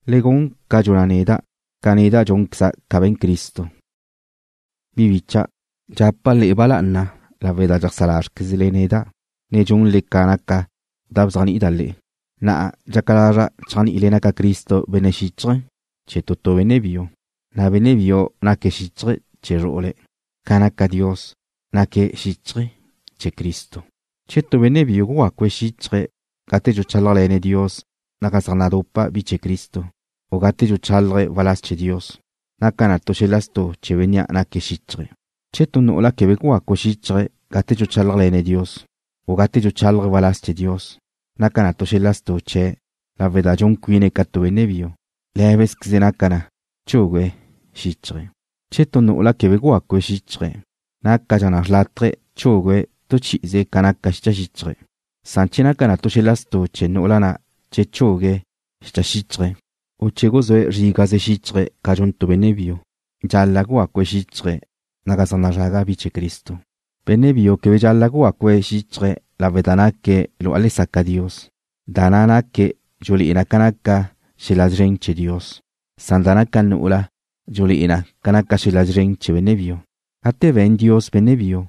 Le gun ca dxuna' neda', ca neda' dxúnqueza' ca be̱n Cristo. Bi bicha', dxapa' le'e ba lá'ana lawe' da dxeajsá lázrequezle neda', ne dxunle ca naca da bzéajni'ida' le'e. Na'a dxaca lazra' chéajni'ile naca Cristo xíchaje̱ chee̱ tu tu benne' biu, na' benne' biu naque̱' xíchaje̱ chee̱ zru'ule̱', ca naca Dios, naque̱' xíchaje̱ chee̱ Cristo. Che tu benne' biu gugácue̱' xíchaje̱' gate dxuchálajle̱ne̱' Dios naga zaj nadupa bi chee̱ Cristo, u gate dxuchálaje̱' waláz chee̱ Dios, naca na tu xel-la stu' chee̱ Bénnea' naque̱' xíchaje̱'. Che tu nu'ula quebe gugácue̱' xíchaje̱' gate dxuchálajle̱ne̱' Dios, u gate dxuchálaje̱' waláz chee̱ Dios, naca na tu xel-la stu' chee̱', lawe' da dxun cuine̱' ca tu benne' biu. Lé̱bezqueze naca na chugue̱' xíchaje̱'. Che tu nu'ula quebe gugacu xíchaje̱', nácadxa xrlátaje chugue̱' tu chi'ize ca naca xicha xíchaje̱'. Na' che naca na tu xel-la stu' chee̱ nu'ula che chugue̱' xíchaje̱', u che guzúe̱' zrígaze xíchaje̱' ca dxun tu benne' biu, dxal-la' gugacu xíchaje̱' naga zaj nazraga bi chee̱ Cristo. Benne' biu quebe dxal-la' gugacu xíchaje̱' lawe' da naque̱' lu'a le saca Dios, na' da naque̱' dxulé'e na ca naca xel-la szren chee̱ Dios. Da naca nu'ula dxulé'e na ca naca xel-la szren chee̱ benne' biu. Gate be̱n Dios benne' biu,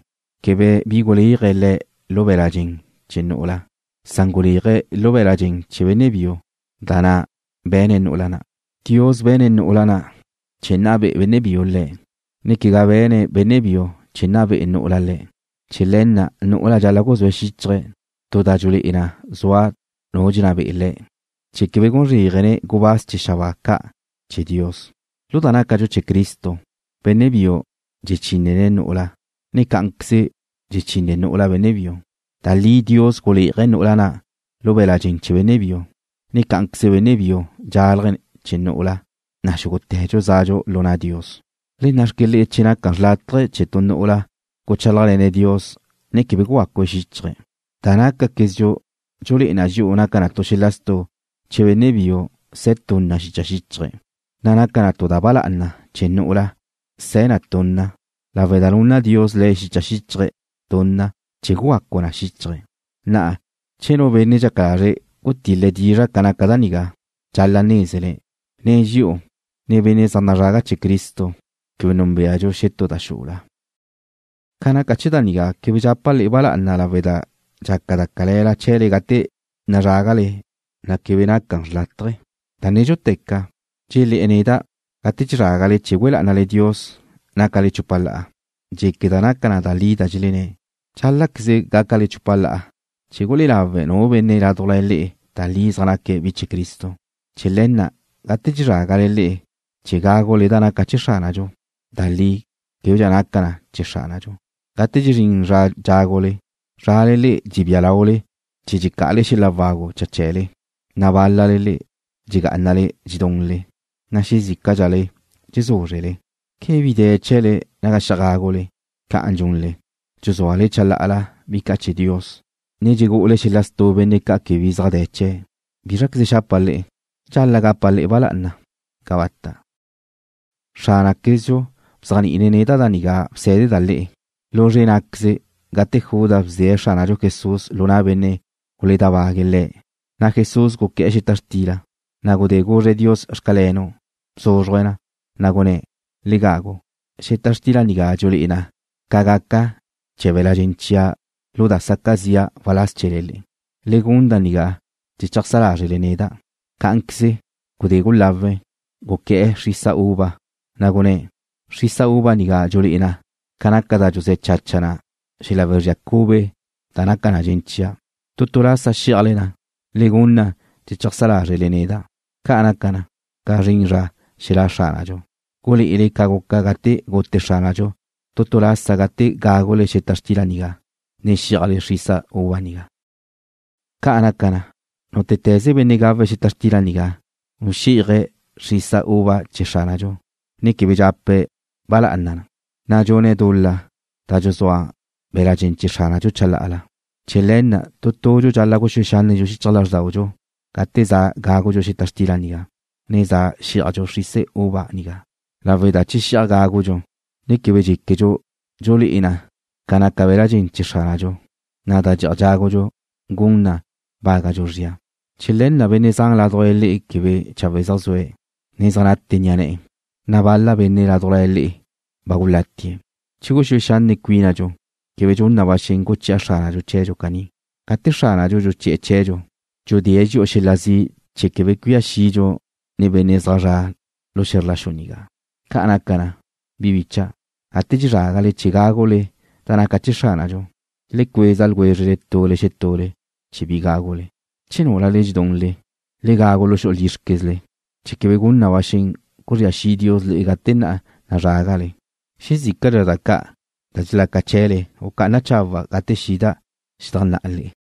quebe bi guléaje̱' le̱' lu be̱la' dxen chee̱ nu'ula, san guléaje̱' lu be̱la' dxen chee̱ benne' biu da na' bexune̱' nu'ula na'. Dios be̱ne̱' nu'ula na' chee̱ nna be'e benne' biu le̱', ne quegá be̱ne̱' benne' biu chee̱ nna be'e nu'ula le̱'. Chee̱ le̱ na' nu'ula dxal-la' guzúe̱' xíchaje̱' tu da dxulé'e na zua nu dxenná be'e le̱' chee̱ quebe gun zréajene̱' gubáz chee̱ xabáa ca' chee̱ Dios. Lu da nácadxu chee̱ Cristo, benne' biu dxechinne̱' nu'ula, ne cá'anqueze dxechín nu'ula benne' biu. Da li Dios guléaje̱' nu'ula na' lu be̱la' dxen chee̱ benne' biu, na' cá'anqueze benne' biu dxálaje̱' chee̱ nu'ula, na' xúgute̱dxu zadxu lu na' Dios. Le nna'xque le'e che naca xrlátaje che tu nu'ula guchálajle̱ne̱' Dios, ne quebe gugacu xíchaje̱'. Da nácaquezdxu dxulé'e na dxi'u naca tu xel-la stu' che benne' biu se̱ tunna xicha xíchaje̱', na' naca tu da ba lá'ana chee̱ nu'ula se̱ na tunna, lawe' da nunna Dios le̱' xicha xíchaje̱' tunna chee̱ gugacu na xíchaje̱'. Na'a che nu benne' dxaca lazre̱' gutil-le̱' dizra' ca naca da nigá, dxal-la' nézene̱' quegá dxi'u ne quegá benne' zaj nazraga chee̱ Cristo quebe núnbeadxu xetú da xula. Ca naca chee̱ da nigá quebe dxapa' le'e ba lá'ana lawe' da dxaca da cale̱la chee̱le gate nazrágale, ne quegá da chawe'. Da nédxuteca, dxulé̱'e̱ neda' gate dxezrágale chee̱ güe lá'anale Dios nácale chupa la'a. Dxéqueda' naca da li da dxelenné̱'. Dxál-la'queze gácale chupa la'a chee̱ gulé'e lawe' nu benne' ládujla le'e da li naque̱' bi chee̱ Cristo. Chee̱ le̱ na' gate dxezrágale le'e chee̱ gágule da naca chee̱ Xránadxu, da li québedxa naca na chee̱ Xránadxu. Gate dxezrín zra dxágule, tu tule le'e dxebía lau chee̱le dxecá'ale xel-la wagu cha chee̱le, na' bál-lale le'e dxegá'anale dxedunle, na' xezícadxale dxezúzrele. ¿Quebe bi de̱ chee̱le naga xi'aj gágule? Ca'an dxunle, dxuzúale chalá'ala bi ca' chee̱ Dios, ne dxugu'ule xel-la stu' benne' ca' quebe bi de̱ chee̱'. ¿Bízraqueze xapa' le'e? ¿Dxal-la' gapa' le'e ba lá'ana? ¡Cabata'! Xránaquezdxu bzéajni'ine̱' neda' da nigá bsé̱deda' le'e: Lu zre' ná'queze gate Judas bdee̱' Xránadxu Jesús lu na' benne' guledábague̱' Le̱', na' Jesús guqué̱'e̱ xeta xtila, na' gudé guzre̱' Dios: Xcalenu', bzúzruje̱' na, na' gunné̱': “Le gagu. Xeta xtila nigá dxulé'e na ca gaca chee̱ be̱l-la' dxen chia' lu da na' saca zi'a waláz chee̱le. Le gun da nigá chee̱ cheajsá lázrele neda'.” Cá'anqueze, gudé gulawe̱', guqué̱'e̱ xrisa uva, na' gunné̱': “Xrisa uva nigá dxulé'e na ca naca da dxuzé̱ chacha na xel-la wezría cube da naca na dxen chia'. Tu tu lasa xí'ajle na, le gun na chee̱ cheajsá lázrele neda'.” Ca' naca na, ca zrin zra xelá' Xránadxu, gulé'ele ca guca gate gute Xránadxu tu tu lasa gate gágule xeta xtila nigá, ne xí'ajle xrisa uva nigá. Ca' naca na, nútete̱ze benne' gawe̱' xeta xtila nigá, u xí'aje̱' xrisa uva chee̱ Xránadxu, ne quebe dxape̱' ba lá'ana na, na' dxune̱' dul-la da dxuzúa be̱la' dxen chee̱ Xránadxu chalá'ala. Chee̱ le̱ na' tu tudxu dxal-la' guxúe xánnedxu xichaj lázrdaudxu gate za gágudxu xeta xtila nigá, ne za xí'ajdxu xrisa uva nigá, lawe' da che xi'aj gágudxu, ne quebe dxéquedxu dxulé'e na ca naca be̱la' dxen chee̱ Xránadxu, na' da xi'aj gágudxu gun na bágadxu zria. Chee̱ le̱ na' benne' zan ládujla le'e quebe chawe' zaj zue̱', ne zaj nate ni'a ne̱'e̱, na' bal-la benne' ládujla le'e ba gulatie̱'. Che guxúe xanne' cuínadxu, quebe gun na ba xen guchi'a Xránadxu chee̱dxu caní. Gate Xránadxu dxuchi'e̱ chee̱dxu, dxudée̱' dxi'u xel-la zi' chee̱ quebe cuía xidxu nen benne' zaj zre̱'e xe̱zr la xu nigá. Ca' naca na, bi bicha'. Gate dxezrágale chee̱ gágule da naca chee̱ Xránadxu, le cueza ljwézrele tule xetule chee̱ bi gágule. Che núlale dxedunle, le gagu lu xu'u lízrquezle, chee̱ quebe gun na ba xen guzría xi' Dios le'e gate na' nazrágale. Xezícadxa da ca' dxelaca chee̱le gucá'ana' chawe' gate xida' xedajnná'a le'e.